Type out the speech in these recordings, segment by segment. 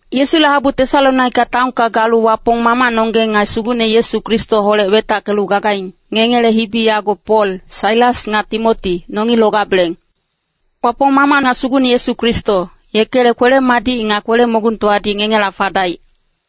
Yesule habu Tesalonika taonka galu Wapong Mamacnonggeng nga Sugucne Yesu Kristoholec wetackelu gagaing, ngengele hibi yago Pol, Sailas nga Timoti, nongi logabeleng. Wapong Mamac nga Sugucne Yesu Kristo, yekele kwele-madic nga kwele-mogungtowadi ngengela fadaic.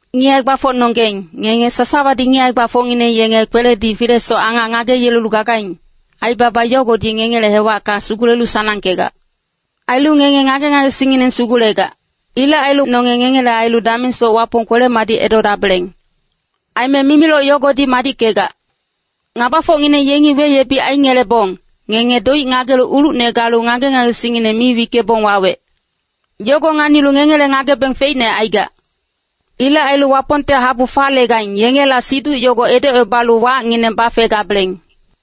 Ngic hae-gbafocnonggeng, ngenge sasawadi ngic hae-gbafocngineng yenge kweledi filesoc angac ngageyelelu gagaing, aibaba yogodi ngengele hewacka sugulelu sanangkegac. Ailu ngenge ngage-ngagesingngineng sugulegac. Ilec ailu nonge ngengele ailu damengsoc Wapong kwele-madic edodabeleng. Aime mimiloc yogodi madickegac. Ngabafocngineng yengi weyebic aingelebong, ngenge doic ngagelu ulucne galu ngage-ngagesingngineng mi wickebong wawec. Yogo nganilu ngengele ngagebeng feicne aigac. Ilec ailu Wapongte habu falegaing, yengela siduc yogo edocebalu wacngineng bafegabeleng.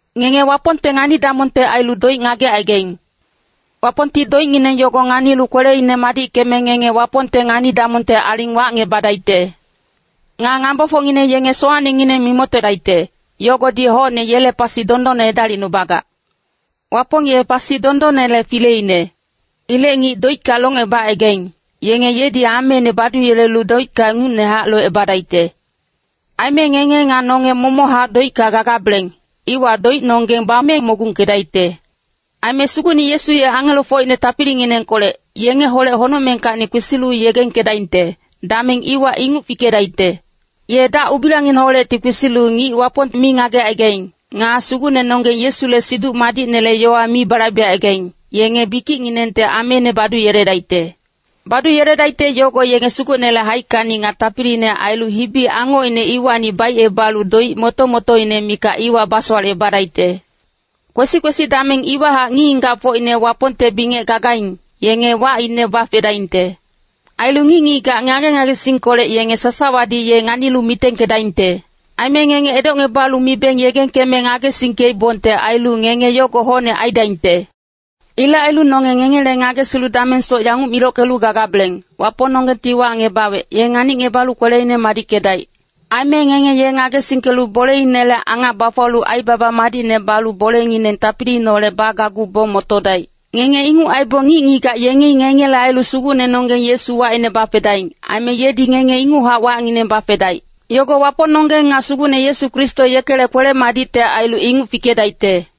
Ngenge Wapongte ngani-damongte ailu doic ngagecaigaing. Wapongti doicngineng yogo nganilu kweleine madickeme ngenge Wapongte ngani-damongte aling wacngebadaicte. Nga ngabafocngineng yenge sowacnengineng mimoctodaicte, yogodi hocne yele pasi dondonne edalicnubagac. Wapong ye pasi dondonnele fileine. Ilec ngic doicka locngebacaigaing, yenge yedi ameine baduyelelu doicka ingucnehac locebadaicte. Aime ngenge nga nonge momochac doicka gagabeleng, iwa doicnonggeng bame mogungkedaicte. Aime Sugucne Yesu ye angelofocine tapilinginengkolec, yengeholec honocmengkacni kwesilu yegengkedaingte, dameng iwa inguc fikedaicte. Ye dac-ubilangineholecti kwesilu ngic Wapong mi ngagecaigaing, nga Sugucnenonggeng Yesule Siduc Madicnele yowa mi balaibecaigaing, yenge bikicnginengte ameine baduyeledaicte. Baduyeledaicte yogo yenge Sugucnele haickacni nga tapiliine ailu hibi-angocine iwacni baicebalu doic moto-motoine mikac iwa basowalecebadaicte. Kwesi-kwesi dameng iwahac ngic-ngigacfocine Wapongte bingec gagaing, yenge wacine bafedaingte. Ailu ngic-ngigac ngage-ngagesingkolec yenge sasawadi ye nganilu mitengkedaingte. Aime ngenge edocngebalu mibeng yegengkeme ngagesingkeibongte ailu, ngenge yogo hocne aidaingte. Ilec ailu nonge ngengele ngagesilu damengsoc yanguc milockelu gagabeleng, Wapongnonggengti wacngebawec, ye nganicngebalu kweleine madickedaic. Aime ngenge ye ngagesingkelu boleinele angac bafuwalu aibaba madicne balu bolengineng tapiliineholec bagacgubong motodaic. Ngenge inguc aibong ngic-ngigac yengi ngengele ailu Sugucnenonggeng Yesu wacine bafedaing, aime yedi ngenge inguchac wacngineng bafedaic. Yogo Wapongnonggeng nga Sugucne Yesu Kristo yekele kwele-madicte ailu inguc fikedaicte.